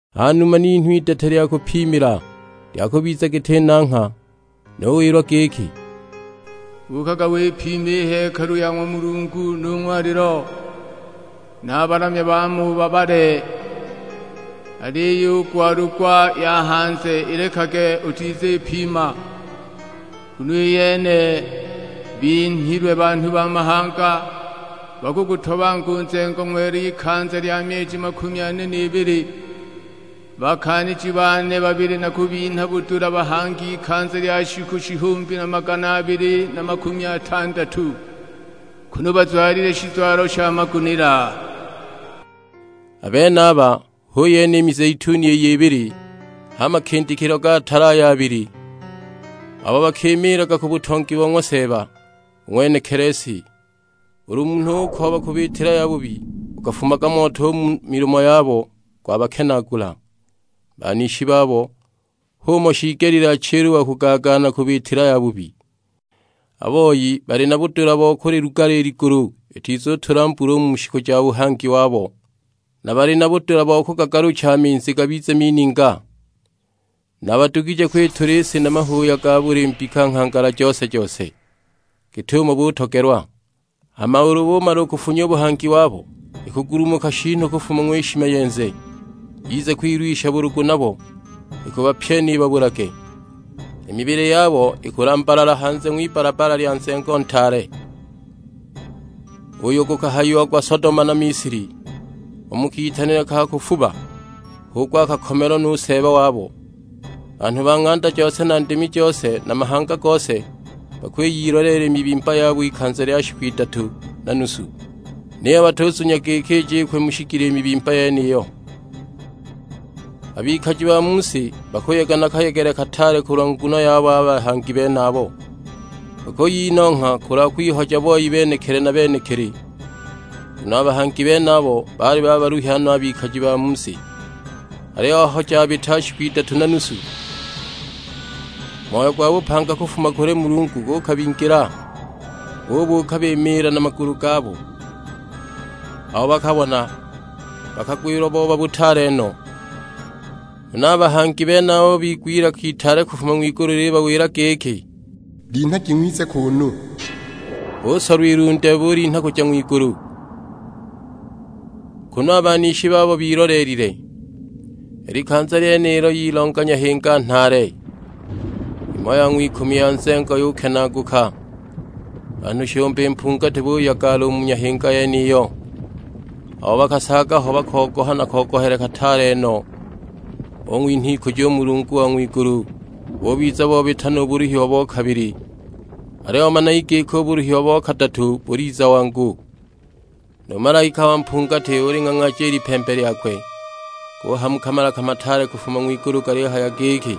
Ha numa ninhwa idete lya kupimila, lya kubiza giti nangha; nuwilwa giki, "Buukaga wipime i hekalu ya ng'wa Mulungu nu ng'walilo; na a balamya baamo ubabale. Aliyo i gwalugwa ya hanze ilekage utizipima, nguno i yene binhilwe banhu ba mahanga; bakugutobanga u nzengo ng'wela ikanza lya myeji makumi ane n'ibili. Bakaaniji bane babili nakubinha budula bahange ikanza lya shiku shihumbi na magana abili na makumi atandatu, kunu bazwalile shizwalo sha magunila." A benaba hu yene i mizeituni iy'ibili; h'a makindikilo ga tala ay'abili, abo bakimiilaga ku butongi bo ng'wa Seeba, u ng'wenekili si. Ulu munhu ukooba kubiitila yabubi, gukafumaga moto u mu milomo yabo gwabakenaagula a banishi babo; h'umo shiigelile achile u wa kugaagaana kubiitila yabubi. A boi bali na budula bo kulilugala i ligulu itizutula mbula u mu shiku ja buhangi wabo. Na bali na budula bo kugagalucha a minzi gabize mininga; na badugije kwitula i si na mahuuya ga buli mbika nghangala jose-jose, git'umo butogelwa. Hama ulu bumala kufunya u buhangi wabo, ikugulumuka shiinu kufuma ng'wishimayenze, yize kwilwisha bulugu nabo; ikubapyena ibabulage. I mibili yabo ikulambalala hanze ng'wibbalabbala lya nzengo ntaale, uyo gukahayiagwa Sodoma na Misili, u mu kitanile ka kufuba; h'uko akakomelwa nu Seeba wabo. Banhu ba ng'anda jose na ndimi jose na mahanga gose bakwiyiloleela i mibimba yabo ikanza lya shiku idatu na nusu; niyo batuzunya giki ijikwe mu shigila i mibimba yeniyo. A bikaji ba mu si bakuyega na kayegele kataale kulwa nguno yabo a bahangi benabo, bakuyinongha kulwa kwihoja boi benekili na benekili, nguno a bahangi benabo baali babaluhya no a bikaji ba mu si. Aliyo aho jabita shiku idatu na nusu, moyo gwa bupanga kufuma kuli Mulungu gukabingila, bubuuka bimiila na magulu gabo! Abo bakabona bakagwilwa booba butaale no. Huna a bahangi benabo bigwa ilaka itaale kufuma ng'wigulu lilibawila giki, "Linhagi ng'wize kuunu!" Busolwa ilunde bulinha kuja ng'wigulu, kunu a banishi babo biloleelile. I likanza lyenilo yilonga nyahinga nhaale; imo ya ng'wikumi ya nzengo yukenaaguka, banhu shihumbi mpungati buyagala u mu nyahinga yeniyo; abo bakasaaga ho bakogoha na kogohele kataale no, bung'winha ikujo u Mulungu wa ng'wigulu. Bubiza bobita nu buluhiwa bo kabili; aliyo managi giki u buluhiwa bo kadatu buliza wangu. Nu malaika wa mpungati uling'ang'aaja i lipembe lyakwe; guhamuka malaka mataale kufuma ng'wigulu galihaya giki,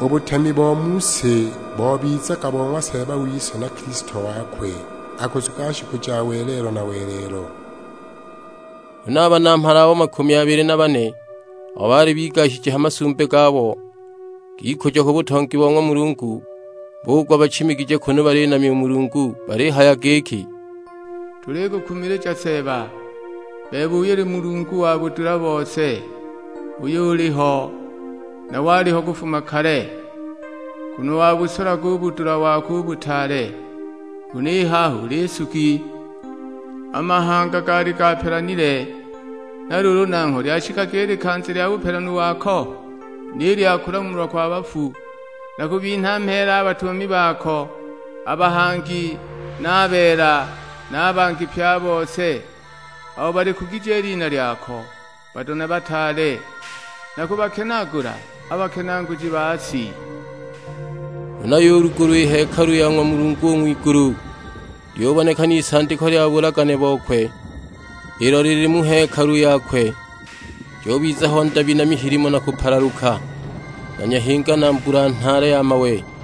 "U butemi bo mu si bobizaga bo ng'wa Seeba wise na Kilisto wakwe, akusuga shiku ja welelo na welelo." Huna a Banamhala abo makumi abili na bane, abo baali bigashije ha masumbi gabo g'ikujo ku butongi bo ng'wa Mulungu, bugwa bachimigije kunu balinamya Mulungu balihaya giki, "Tulikukumilija Seeba, bebe uyo uli Mulungu wa budula bose, uyo uliho, na waliho kufuma kale. Nguno wabusolaga u budula wako u butaale, huna i haha uli Nsugi. A mahanga gaali gapelanile, na luulu nangho lyashikaga i likanza lya bupelanu wako, ni lya kulamulwa kwa bafu, na kubinha mheela a batumami bako, a bahangi na a beela, na a bangi pye a bose, abo balikugije i lina lyako, bado na bataale; na kubakenaagula a bakenaaguji ba si!" Huna yulugulwa i hekalu ya ng'wa Mulungu u ng'wigulu, lyubonekana isandiko lya bulagane bokwe, ilo lili mu hekalu yakwe; jubiza ho ndabi na mihilimo na kupalaluka, na nyahinga na mbula nhaale ya mawe!